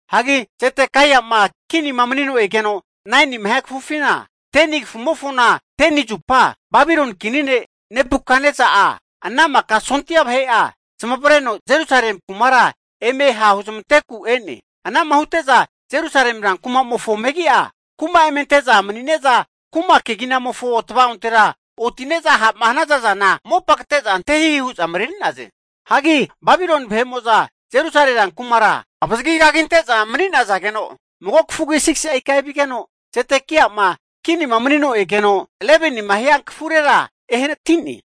Hagi Zedekai'ma kinima manino egeno 9nima hia kafufina, 10ni ikamofona 10ni zupa, Babiloni kini ne' Nebukatnesa'a ana maka sondia vahe'a zamavareno Jerusalemi kumara eme hahuzmanteku e'ne. Anama hute'za Jerusalemi ran kuma'mofo megi'a kuma eme ante'za mani'ne'za, kuma keginamofo tva'ontera oti'ne'za ha'ma hanaza zana mopa kate'za ante hihi hu'za mareri'naze. Hagi Babiloni vahe'mo'za Jerusalemi rankumara avazagi kaginte'za mani nazageno, mago kafugi 6si'a ika evigeno, Zedekai'ma kinima manino egeno 11nima hia kafurera ehanati'ne.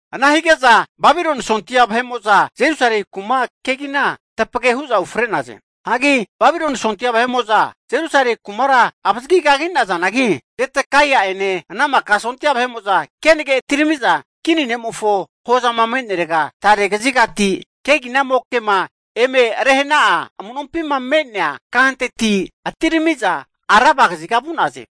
Ana hige'za Babiloni sondia vahe'mo'za Jerusalemi kuma kegina tapage hu'za ufre'naze. Hagi Babiloni sondia vahe'mo'za Jerusalemi kumara avazagi kagi'nazanagi, Zedekaia'ene ana maka sondia vahe'mo'za kenage atirami'za, kini ne'mofo hozama me'nerega tare kazigati keginamokema eme rehe'na'a amu'nompima me'nea kahanteti atirami'za Araba kaziga vu'naze.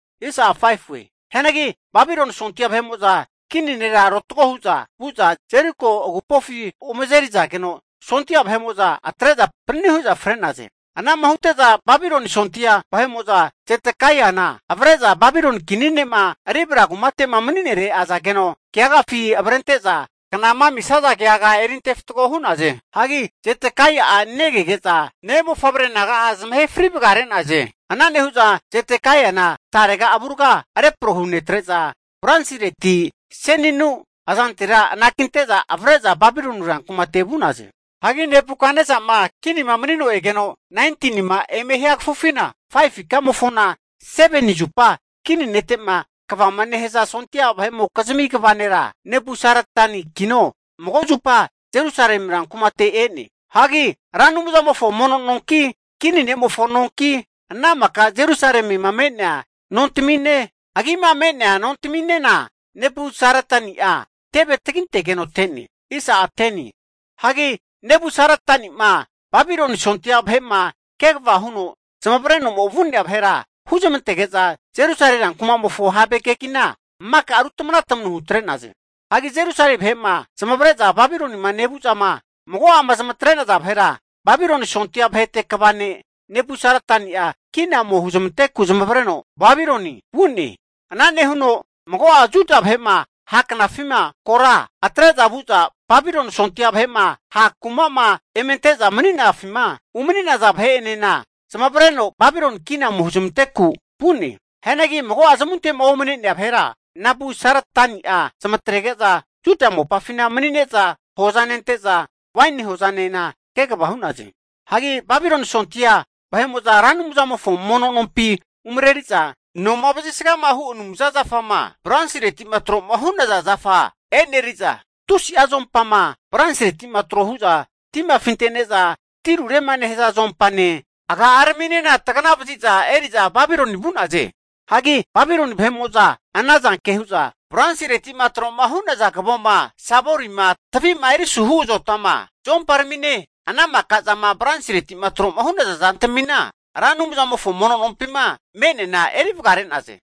Hianagi Babiloni sondia vahe'mo'za kini nera rotago hu'za vu'za Jeriko agupofi ome azerizageno, sondia vahe'amo'za atre'za panani hu'za fre'naze. Anama hute'za Babiloni sondia vahe'mo'za Zedekaiana avre'za Babiloni kini ne'ma Ribla kumate'ma mani'nere azageno, keagafi avrente'za knama amisia keaga erinte fatgo hu'naze. Hagi Zedekai'a negege'za ne'mofavre naga'a zamahe fri vagare'naze. Ana nehu'za Zedekaiana tarega avurga repro hunetre'za, bronsireti seninu azantera anakinte'za avre'za Babiloni rankumate vu'naze. Hagi Nebukatnesa'ma kinima manino egeno 19nima eme hia kafufina, 5fu ikamofona 7ni zupa, kini nete'ma kvama nehaza sondia vahe'mokizmi kva nera Nebusaradanikino mago zupa Jerusalemi rankumate e'ne. Hagi Ra Anumzamofo mono nonki, kini ne'mofo nonki, ana maka Jerusalema me'nea nontamine, agima me'nea nontaminena Nebusaradani'a teve tagintegeno te'ne. Hagi Nebusaradani'ma Babiloni sondia vahe'ma kegava huno zamavareno'ma vu'nea vahera huzmantege'za Jerusalemi rankuma'mofo have kegina, maka ru tamana tamanu hutre'naze. Hagi Jerusalemi vahe'ma zamavare'za Babilonima nevu'zama mago'ama zamatre'naza vahera, Babiloni sondia vahete kva ne' Nebusaradani'a kina ome huzmanteku zamavareno Babiloni vu'ne. Ana nehuno mago'a Juda vahe'ma ha' knafima kora atre'za vu'za Babiloni sondia vahe'ma ha' kuma'ma emente'za mani'nafima umani'naza vahe'enena zamavareno Babiloni kina ome huzmanteku vu'ne. Hianagi mago'a zamunte'ma omne'nea vahera, Nebusaradani'a zamatrege'za Juda mopafina mani'neza hoza nente'za waini hozanena kegava hu'naze. Hagi Babiloni sondia vahe'mo'za Ra Anumzamofo mono nompi umareri'za, noma vazisgama hu (fumza) anumza zafama Bronsireti'ma tro'ma hu'naza zafa e'neri'za, tusi'a zuompama bronsireti'ma tro hu'za tima afinte'ne'za tirurema nehaza zuompane, aga'araminena tagana vazi'za eri'za Babiloni vu'naze. Hagi Babiloni vahe'mo'za ana zanke hu'za, bronsireti'ma tro'ma hu'naza kavoma, savorima tavi'ma erisuhu azotama, zuomparamine, ana maka zama brosireti'ma tro'ma hu'naza zantamima Ra Anumzamofo mono nompima me'neana eri vagare'naze.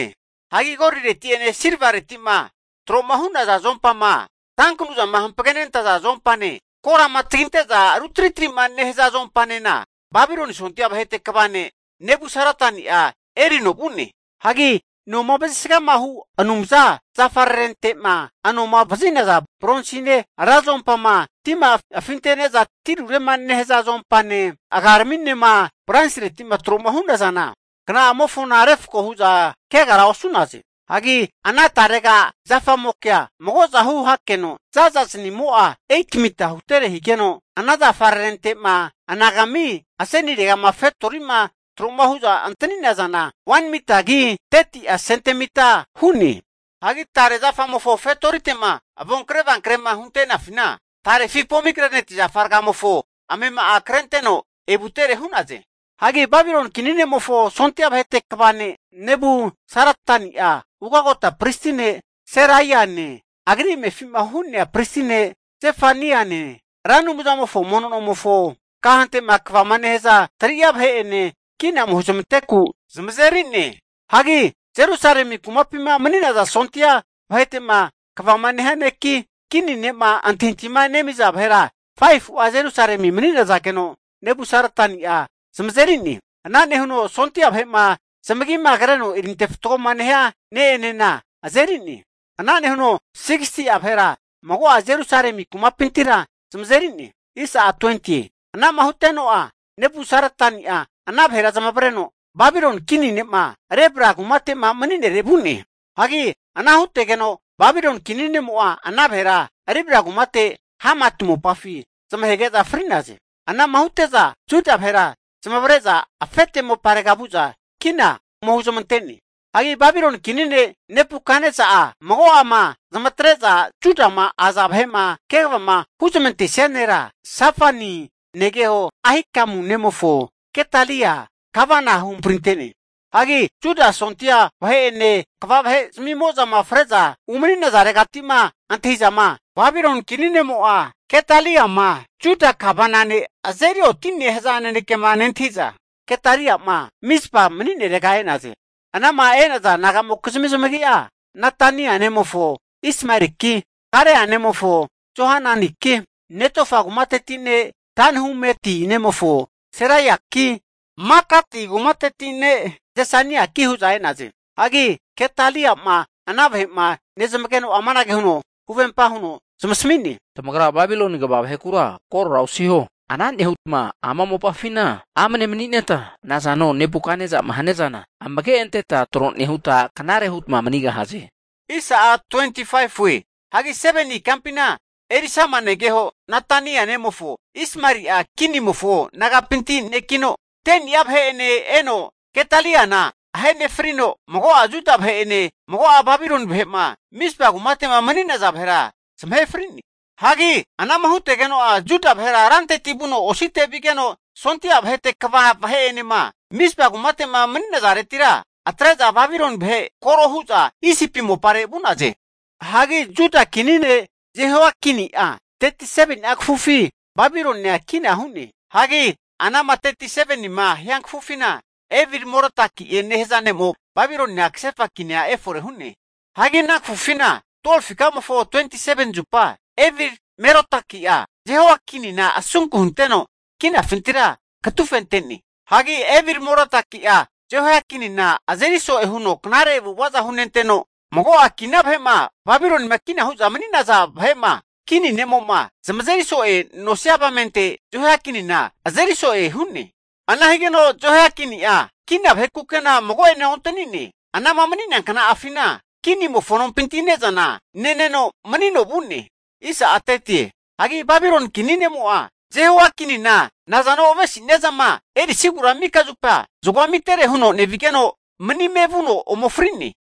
Hagi golireti'ene silvareti'ma tro'ma hu'naza zuompama tankanuzama hampagenente'za zuompane, korama taginte'za ru tri tri'ma nehaza zuompanena Babiloni sondia vahete kva ne' Nebusaradani'a erino vu'ne. Hagi noma vazisgama hu (fumza) anumza zafararente'ma anoma vazi'naza bronsine, ra zuompama tima afintene'za tirurema nehaza zuompane, aga'araminema bronsiretima tro'ma hu'nazana, kna'amofona refko hu'za kegara osu'naze. Hagi ana tarega zafamokea magozahu hakeno za'za zaniamo'a 8'a mita hutere higeno, ana zafararente'ma anagami asenire'ma fetori'ma tro'ma hu'za ante'nazana 1mitagi 30'a sentamita hu'ne. Hagi tare zafamofo fetorite'ma avonkre avankre'ma hunte'nafina, tarefi pomigreneti zafa ragamofo amema'a krente'za evutere hu'naze. Hagi Babiloni kini ne'mofo sondia vahete kva ne' Nebusaradani'a, ugagota pristi ne' Seraiane, agri amefima hu'nea pristi ne' Zefanaiane Ra Anumzamofo mono nomofo kahante'ma kvama nehaza 3'a vahe'ene, kina ome huzmanteku zamazeri'ne. Hagi Jerusalemi kumapima maniza sondia vahete'ma kvama nehia neki, kini ne'ma antahintahima nemiza vahera 5fu'a Jerusalemi mani'nazageno Nebusaradani'a zamazeri'ne. Ana nehuno sondia vahe'ma zamagima kreno erinte fatgo nehia ne'enena azeri'ne. Ana nehuno 60'a vahera mago'a Jerusalemi kumapintira zamazeri'ne. Ana'ma huteno'a Nebusaradani'a ana vahera zamavareno Babiloni kini ne'ma Ribla kumate'ma mani'nere vu'ne. Hagi ana huntegeno Babiloni kini nemo'a ana vahera Ribla kumate Hamati mopafi zamahege'za fri'naze. Anama hute'za Juda vahera zamavare'za afete moparega vu'za kina ome huzmante'ne. Hagi Babiloni kini ne' Nebukatnesa'a mago'ama zamatre'za Judama aza vahe'ma kegavama huzmantesia nera, Safani negeho Ahikamu nemofo Gedalia gavana huhamprinte'ne. Hagi Juda sondia vahe'ene, kva vahe'zamimo'zama fre'za umani'nazaregati'ma antahi'zama, Babiloni kini ne'mo'a Gedaliama Juda gavana ne' azeri oti'ne haza nanekema nentahi'za, Gedalia'ma Mizpama mani'nere e'naze. Anama e'naza nagamokizmi zamagi'a, Netania nemofo Ismaeliki, Karea nemofo Johananiki, Netofa kumateti ne' Tanhumeti nemofo Seraiaki, Makati kumateti ne' Zesaniaki hu'za e'naze. Hagi Gedalia'ma ana vahe'ma nezamageno'a amanage huno huvempa huno zamasami'ne, tamagra Babiloni kva vahekura korora osiho. Ana nehutama ama mopafina amne mani'neta nazano Nebukatnesa'ma haniazana amage anteta tro nehuta, knare hutma manigahaze. Hianagi 7ni ikampina Elishama negeho Netania nemofo Ismaeli'a kinimofo naga'pinti nekino, 10ni'a vahe'ene eno Gedaliana ahe nefrino, mago'a Juda vahe'ene, mago'a Babiloni vahe'ma Mizpa kumate'ma mani'naza vahera zamahe fri'ne. Hagi anama hutegeno'a Juda vahera ranteti vuno osite vigeno, sondia vahete kva vahe'enema Mizpa kumate'ma mani'nazaretira atre'za Babiloni vahe koro hu'za Isipi moparega vu'naze. Hagi Juda kini ne' Jehoiakini'a 37ni'a kafufi Babilonia kina hu'ne. Hagi anama 37nima hia kafufina Evil-Merodaki'e nehaza ne'mo Babilonia kasefa kinia efore hu'ne. Hagi ana kafufina 12fu ikamofo 27ni zupa Evil-Merodaki'a Jehoiakinina asunku hunteno kinafintira katufente'ne. Hagi Evil-Merodaki'a Jehoiakinina azeri so'e huno knare avu'avaza hu'nenteno mago'a kina vahe'ma Babilonima kina hu'za mani'naza vahe'ma kini ne'mo'ma zamazeri so'e nosia avamente Jehoiakinina azeri so'e hu'ne. Ana higeno Jehoiakini'a kina vahe kuke'na mago'ene ontani'ne. Anama mani'nea kna'afina kinimofo nompinti ne'zana neneno manino vu'ne. Hagi Babiloni kini ne'mo'a, Jehoiakinina nazano avesi'nia zama erisigura mika zupa zagoa amitere huno nevigeno, manime vuno ome fri'ne.